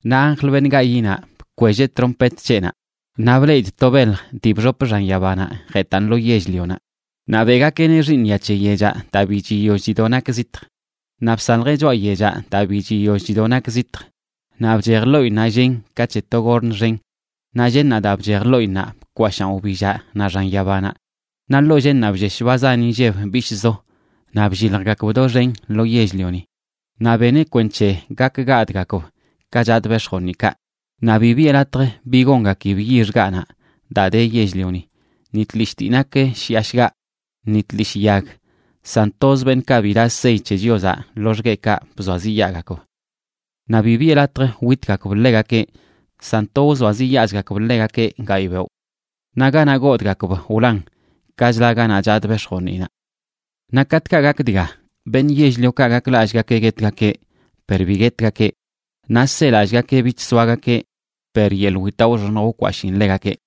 Naꞌ anjl, beṉꞌ gayiꞌnaꞌ, bkwelleꞌ trompet c̱heꞌnaꞌ, naꞌ bleꞌidꞌ to belj dii bxop xan yabanaꞌ jetꞌan lo yell-lionaꞌ. Naꞌ beꞌgakeꞌneꞌ xiiṉya c̱he yechaꞌ daa bi chiyoll chido nak zitj. Naꞌ bsaljeꞌ choꞌa yechaꞌ daa bi chiyoll chido nak zitj naꞌ bchej ḻoꞌinnaꞌ llen ka c̱he to gorn xen. Naꞌ llennaꞌ daa bchej ḻoꞌinnaꞌ bkwashaan wbillaꞌ naꞌ xan yabanaꞌ. Naꞌ ḻoo llennaꞌ bllesh ba zan inlleb bishꞌzo naꞌ blliljgakb doxen lo yell-lioni. Naꞌ beneꞌ kwenc̱he gak gadꞌgakb ka chadꞌ bex̱joniꞌkaꞌ. Naꞌ bi biꞌe latj bi gongakib yix gaꞌnaꞌ daa de yell-lioni, ni tlishꞌ dii nak shiꞌa shgaꞌ, ni tlishꞌ yag, san toz beṉꞌkaꞌ bi daꞌ sey c̱he Chiozaꞌ loxgueꞌkaꞌ bzoaziꞌyaagakb. Naꞌ bi biꞌe latj witgakb ḻegakeꞌ, san to wzoaziꞌyaazgakb ḻegakeꞌ gayꞌ beoꞌ. Naꞌ ganaꞌ godꞌgakb wlan ka chla ganaꞌ chadꞌ bex̱joniꞌnaꞌ. Naꞌ katꞌkaꞌ gak dga, beṉꞌ yell-liokaꞌ gaklallꞌgakeꞌ guetgakeꞌ per bi guetgakeꞌ; naꞌ selallꞌgakeꞌ bich soagakeꞌ per yeḻꞌ witaꞌ wxoṉj wkwashiin ḻegakeꞌ.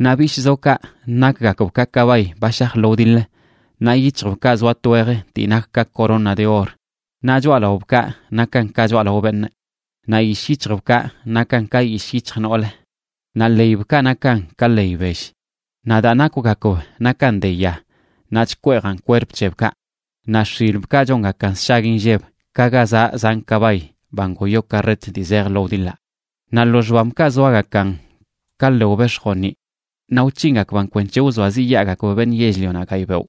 Naꞌ bishꞌzokaꞌ nakgakb ka kabay ba shaj lo wdiḻ. Naꞌ yic̱hjbkaꞌ zoa twej dii nak ka corona de or, naꞌ choꞌalaobkaꞌ nakan ka choꞌalao beṉꞌ. Naꞌ yishꞌ yic̱hjbkaꞌ nakan ka yishꞌ yic̱hj noolə, naꞌ ḻeybkaꞌ nakan ka ḻey bell. Naꞌ daa nakwgakb nakan de ya naꞌ chkweejan kwerp c̱hebkaꞌ. Naꞌ x̱ilbkaꞌ chongakan sshag inlleb ka ga zaꞌ zan kabay ba ngoyo karret dii zej lo wdiḻaꞌ. Naꞌ lo xbambkaꞌ zoagakan ka ḻew bex̱joniꞌ, naꞌ wc̱hingakban kwenc̱he wzoaziꞌyaagakb beṉꞌ yell-lionaꞌ gayꞌ beoꞌ.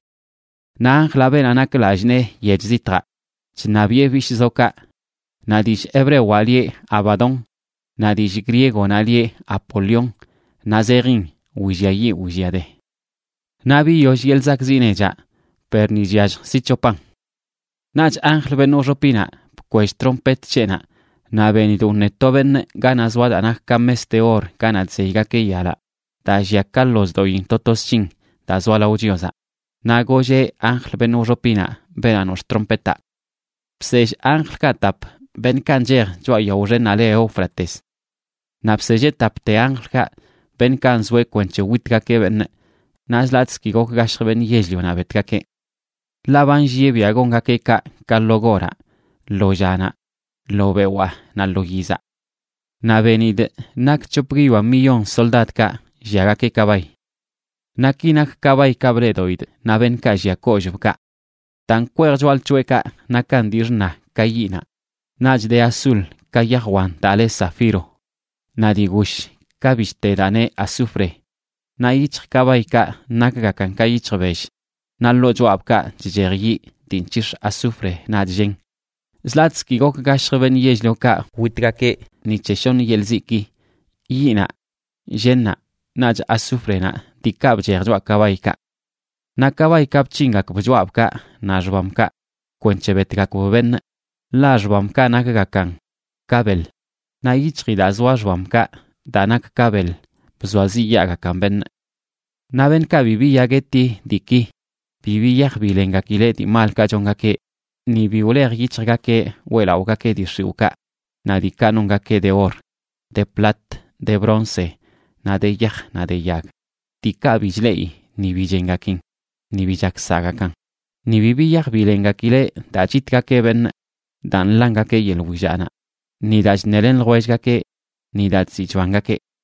Naꞌ anjlaꞌ, beenaꞌ nak lallꞌ nee yech zitjaꞌ, chṉabiꞌe bishꞌzokaꞌ, naꞌ dillꞌ hebrewaꞌ lieꞌ Abadón, naꞌ dillꞌ griegonaꞌ lieꞌ Apolión, naꞌ zejin Williayiꞌ Williade. Naꞌ biyoll yeḻꞌ zakꞌziꞌ nechaꞌ, per ni chyallj zi c̱hopan. Naꞌch anjl, beṉꞌ wxopinaꞌ, bkwell trompet c̱heꞌnaꞌ, naꞌ benidꞌ wṉe to beṉꞌ ganaꞌ zoa daa nak ka mes de or ganaꞌ chzeygakeꞌ yalaꞌ daa llia ka ḻozdoꞌin to to sc̱hin daa zoa lao Chiozaꞌ. Naꞌ golleꞌ anjl, beṉꞌ wxopinaꞌ, beenaꞌ nox̱ꞌ trompetaꞌ: ―Bsell anjlkaꞌ tap, beṉꞌkaꞌ nchej choꞌa yao xennaꞌ le Éufrates. Naꞌ bselleꞌ tapte anjlkaꞌ, beṉꞌkaꞌ nzoeꞌ kwenc̱he witgakeꞌ beṉꞌ, naꞌ zi latꞌzə ki gok gashjəa beṉꞌ yell-lionaꞌ betgakeꞌ. Ḻaꞌ ba nllieꞌ biaꞌ gongakeꞌ kaꞌ ka lo goraꞌ, lo llanaꞌ, lo bewaa, naꞌ lo yizaꞌ. Naꞌ benidꞌ nak c̱hop guiyoa millón soldadkaꞌ lliagakeꞌ kabay. Naꞌ ki nak kabaykaꞌ bleꞌdoꞌidꞌ naꞌ beṉꞌkaꞌ llia kollꞌbkaꞌ: daa nkweej choꞌalc̱hoꞌekaꞌ nakan dii xṉa ka yiꞌnaꞌ, naꞌch de azul ka yaj wan daa le zafiro, naꞌ dii gush ka bishte daa neꞌ azufre. Naꞌ yic̱hj kabaykaꞌ nakgakan ka yic̱hj bell, naꞌ ḻoo choꞌabkaꞌ chchej yiꞌ dii nc̱hix̱ azufre naꞌch llen. Zlatꞌzə ki gok gashjəb beṉꞌ yell-liokaꞌ witgakeꞌ ni c̱he shoṉ yeḻꞌ ziꞌki: yiꞌnaꞌ, llennaꞌ, naꞌch azúfrenaꞌ diikaꞌ bchej choꞌa kabaykaꞌ. Naꞌ kabaykaꞌ, bc̱hingakb choꞌabkaꞌ naꞌ xbambkaꞌ kwenc̱he betgakb beṉꞌ, ḻaꞌ xbambkaꞌ nakgakan ka beḻ, naꞌ yic̱hji daa zoa xbamkaꞌ daa nak ka beḻ bzoaziꞌyaagakan beṉꞌ. Naꞌ beṉꞌkaꞌ bi biya gueti diiki, bi biyaj bilengakileꞌ dii malkaꞌ chongakeꞌ, ni bi wlej yic̱hjgakeꞌ weꞌlaꞌogakeꞌ dii xiwꞌkaꞌ naꞌ diikaꞌ nongakeꞌ de or, de plat, de bronce, naꞌ de yaj naꞌ de yag, diikaꞌ bi chleꞌi ni bi chengakin, ni bi chak saꞌgakan. Ni bi biyaj bilengakileꞌ daa chitgakeꞌ beṉꞌ, daa nḻangakeꞌ yeḻꞌ willaꞌnaꞌ, ni daa chṉelen ljwellgakeꞌ, ni daa chziꞌ chbangakeꞌ.